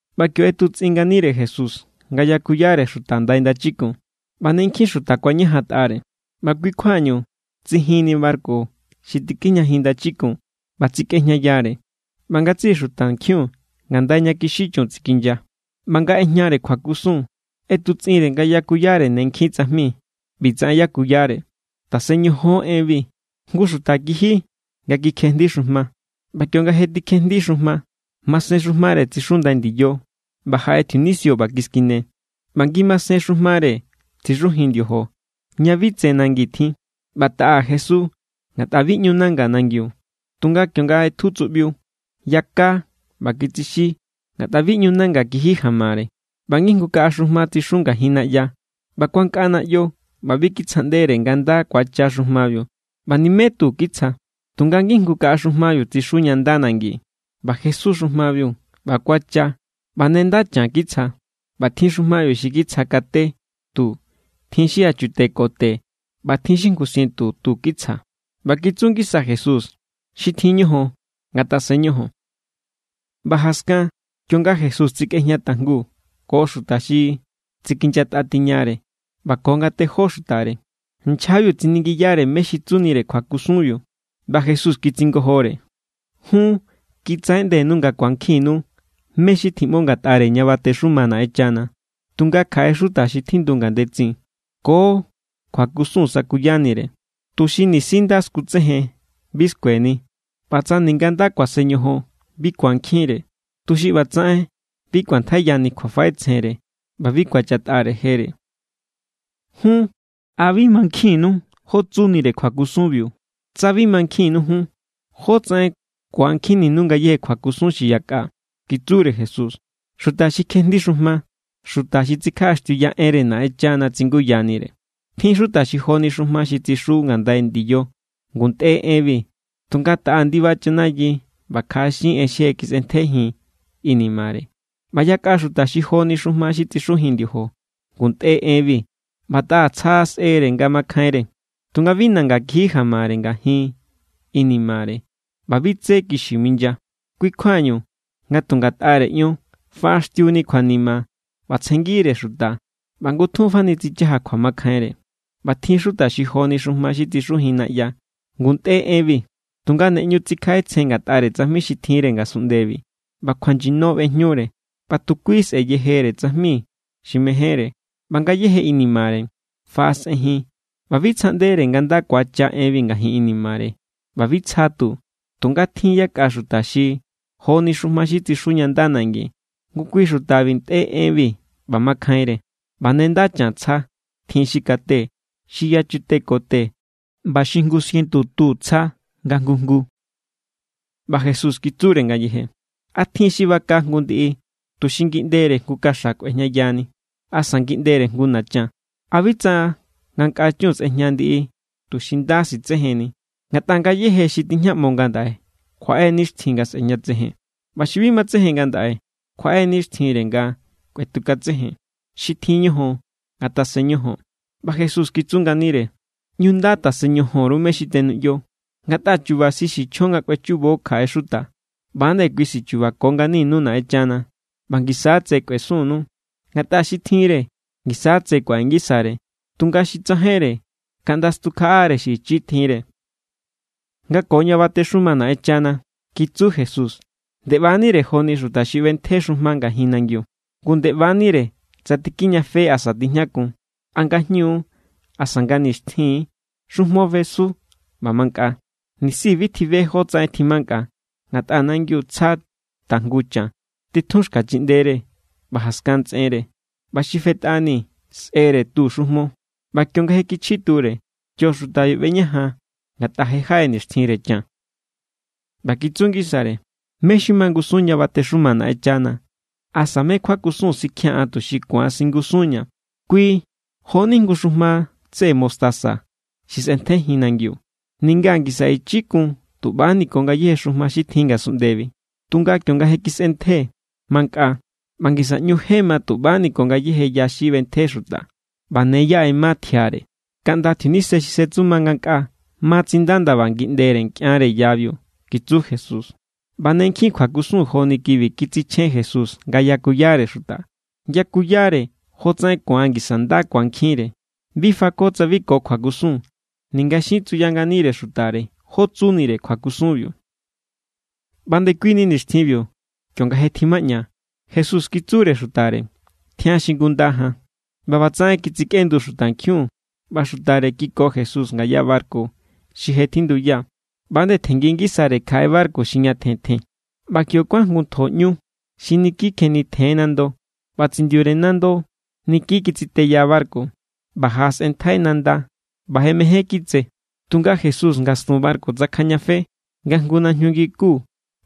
ꞌBa kio ꞌetutsꞌin nganire Jesús nga yakuyare xuta ndai ndachikun, ꞌba ne nkjin xuta kuañajantꞌare. ꞌBa kui= kjuañu, tsijinni barku xi tikijñajin ndachikun ꞌba tsikꞌejñayare, ꞌba ngatsiꞌi xutankjiun ngandai ña kixí chun tsikinya. ꞌBa nga ꞌejñare kjuakusun; ꞌetutsꞌinre nga yakuyare ne nkjin tsajmi. ꞌBi tsaꞌen yakuyare: —Tasen ñojon enbi: Jngu xuta kiji nga kikjejndi xujma. ꞌBa kionga je tikjejndi xujma, masen xujmare tsixu ndai ndiyo; ꞌba jaꞌe tjiunisio ꞌba kiskine. ꞌBa ngimasen xujmare tsixujin ndiojo, ña bi tse nangi tjin; ꞌba taꞌa jesu ngatꞌa bi ꞌñu nanga nangiu. Tunga kionga ꞌetju tsuꞌbiu, yaka ꞌba kitsixí ngatꞌa bi ꞌñu nanga kiji jamare. ꞌBa ngijngu kaꞌa xujma tsixu ngajin naꞌya, ꞌba kuankꞌa naꞌyo ꞌba bi kitsjaꞌndere nga nda kuacha xujmabiu, ꞌba nimé tu kitsja. Tunga ngijngu kaꞌa xujmabiu tsixu ña nda nangi. ꞌBa jesu xujmabiu ꞌba kuacha, ꞌba ne nda chan kitsja; ꞌba tjin xujmabiu xi kitsja kate tu, tjin xi yachute ko te, ꞌba tjin xi jngu sientu tu kitsja. ꞌBa kitsu ngisa Jesús: —Xi tjin ñojon, ngatasen ñojon. ꞌBa jaskan, kionga Jesús tsikꞌejña tajngu ko xuta xi tsikinyatꞌa tiñare ꞌba ko nga tejó xutare, nchjabiu tsiningiyare mé xi tsunire kjuakusunbiu. ꞌBa Jesús kitsingojore: —Jun, kitsaꞌeꞌndenu nga ku̱ankjinnu mé xi tjiꞌmo ngatꞌare ña batexuma Naꞌenchana; tunga kjaꞌe xuta xi tjindu ngandetsin, ko kjuakusun sakuyanire; tuxi nisi nda skutsejen, bi skueni, ꞌba tsa ninga nda kuasen ñojon, bi ku̱ankjinre, tuxi ꞌba tsaꞌen bi kꞌuantjaiyani kjuafaꞌetsjenre ꞌba bi ku̱achatꞌare jere. ’Jun, ¿a bi mankjinnu jó tsunire kjuakusunbiu? Tsa bi mankjinnu jun, ¿jótsaꞌen ku̱ankjinninu ngayéje kjuakusun xi yakꞌa? —kitsure Jesús—. Xuta xi kjejndi xujma xuta xi tsikjaꞌaxtiuya enre Naꞌenchana tsinguyanire. Tjin xuta xi joni xujma xi tsixu ngandai ndiyo: ngu ntꞌe enbi, tunga taꞌa ndiba chanayi ꞌba kjaꞌaxin en xi je kisꞌentjejin inimare. ꞌBa yakꞌa xuta xi joni xujma xi tsixujin ndiojo: ngu ntꞌe enbi ꞌba taꞌa tsja sꞌere nga makjainre, tunga bi nanga kiji jamare ngajin inimare ꞌba bi tsé kixi minya; kui= kjuañu, nga tu ngatꞌare ion faꞌaxtiuni kjuanima ꞌba tsjenngire xuta ꞌba ngutjun fani tsichaja kjuamakjainre. ꞌBa tjin xuta xi joni xujma xi tsixujin naꞌya: ngu ntꞌe enbi, tunga ne ꞌñu tsikjaꞌetsjen ngatꞌare tsajmi xi tjinre ngasunꞌndebi, ꞌba kjuanyino ꞌbejñure ꞌba tu kui sꞌe̱ yejere tsajmi xi mejénre. ꞌBa ngayejebi inimare faꞌasꞌenjin ꞌba bi tsjaꞌndere nga nda ku̱acha enbi ngajin inimare, ꞌba bi tsja tu. Tunga tjin yakꞌa xuta xi joni xujma xi tsixu ña nda nangi: ngu kui xutabi ntꞌe enbi ꞌba makjainre, ꞌba ne nda chan tsja. Tjin xi kate, xi yachute ko te, ꞌba xi jngu sientu tu tsja nga jngu jngu. ꞌBa Jesús kitsure ngayeje: —¿A tjin= xi baka jngu ndiꞌi tuxi ngiꞌndere jngu kaxa kꞌuejñayani asa ngiꞌndere jngu nachan? ¿A bi tsa nga nkꞌa chun sꞌejña ndiꞌi tuxi nda sitsejenni? Ngatꞌa ngayéje xi tijñaꞌmo ngandaꞌe kjuaꞌe nixtjin nga sꞌe̱jñatsejen; ꞌba xi bi matsejen ngandaꞌe kjuaꞌe nixtjinre nga kꞌuetukatsejen. Xi tjin ñojon, ngatasen ñojon. ꞌBa Jesús kitsu nganire: —ꞌÑu nda tasen ñojon_ru mé xi tenuꞌyo. Ngatꞌa chu̱ba̱ xi sichjon nga kꞌuechubo kjaꞌe xuta, ꞌba=nde kui xi sichubako nganinu Naꞌenchana; ꞌba ngisa= tse kꞌuesunnu. Ngatꞌa xi tjinre, ngisa= tse kuaꞌe ngisare; tunga xi tsajainre, kaꞌnda stukjaꞌare xi ichi tjinre. ’Nga ko ña batexuma Naꞌenchana —kitsu Jesús— nde ꞌba=nire joni xuta xi ꞌbentje xujma ngajin nangiu; ngu nde ꞌba=nire tsa tikijñafe asa tijñakun, a ngajñu= asa nga nixtjin=, xujmo fesu ꞌba mankꞌa, nisi bi tjibe jótsaꞌen tjimankꞌa. Ngatꞌa nangiu tsja tajngu chan; titjun xka chiꞌndere, ꞌba jaskan ntsꞌenre, ꞌba xi fetꞌani sꞌere tu xujmo; ꞌba kionga je kichji ture, kio xutabiu ꞌbeñajan, ngatꞌa je= jaꞌe nixtjinre chan. ꞌBa kitsu ngisare: —¿Mé xi mangusun ña batexuma Naꞌenchana, asa mé kjuakusun sikjia̱n an tuxi ku̱an singusunña? Kui jo=ni jngu xujma tseꞌe mostaza xi sꞌentjejin nangiu. Ninga ngisa ichi kun tuꞌbani ko ngayéje xujma xi tjin ngasunꞌndebi; tunga, kionga je kisꞌentje, mankꞌa ꞌba ngisa ꞌñu je ma tuꞌbani ko ngayéje ya xi ꞌbentje xuta, ꞌba ne yaꞌe= ma tjiare kaꞌnda tjiunise xi setsuma ngankꞌaa ma tsinda ndaba ngiꞌndere nkꞌianre yabiu —kitsu Jesús. ꞌBa ne nkjin kjuakusun joni kibi kitsichjen Jesús nga yakuyare xuta. Yakuyare jotsaꞌen ku̱an ngisa nda ku̱ankjinre. Bi fako tsa bi ko jngu kjuakusun, ninga xin tsuyanire xutare jó tsunire kjuakusunbiu. ꞌBa ndekuini nixtjinbiu, kionga je tjimaꞌña, Jesús kitsure xutare: —Tjian xingunda jan. ꞌBa ꞌbatsaꞌen kitsikꞌendu xutankjiun ꞌba xutare kiko Jesús ngaya barku xi je tjinduya, ꞌba=nde tjenngi ngisare kjaꞌe barku xi ñatjen tjen. ꞌBa kio kuán jngu ntjo ꞌñu xi niki kjenitjen= nando ꞌba tsindiure nando niki kitsiteya barku, ꞌba jaꞌasꞌenntjai nanda, ꞌba je mején kitse. Tunga Jesús ngastun barku tsakjajñafe, nga jngu najñu ngiku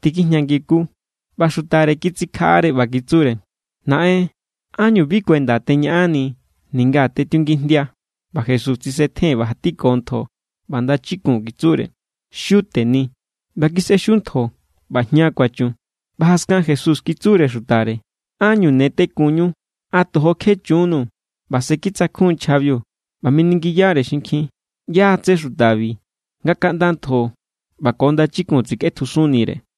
tikjijña ngi ku; ꞌba xutare kitsikjaꞌare ꞌba kitsure: —¡Naꞌen! ¿Ánñu bi kuenda teñaꞌanni ninga tetiungijndia? ꞌBa Jesús tsisetjen ꞌba jatiko ntjo ꞌba ndachikun kitsure: —¡Xiu teni! ꞌBa kisꞌexiu ntjo ꞌba jña kuachun. ꞌBa jaskan Jesús kitsure xutare: —¿Ánñu ne tekunñu? ¿A tojo kje chunnuu̱? ꞌBa se kitsakjun= nchjabiu, ꞌba miningiyare xinkjin: —¿ꞌYá= tsé xutabi, nga kaꞌnda ntjo ꞌba ko ndachikun tsikꞌetjusunnire?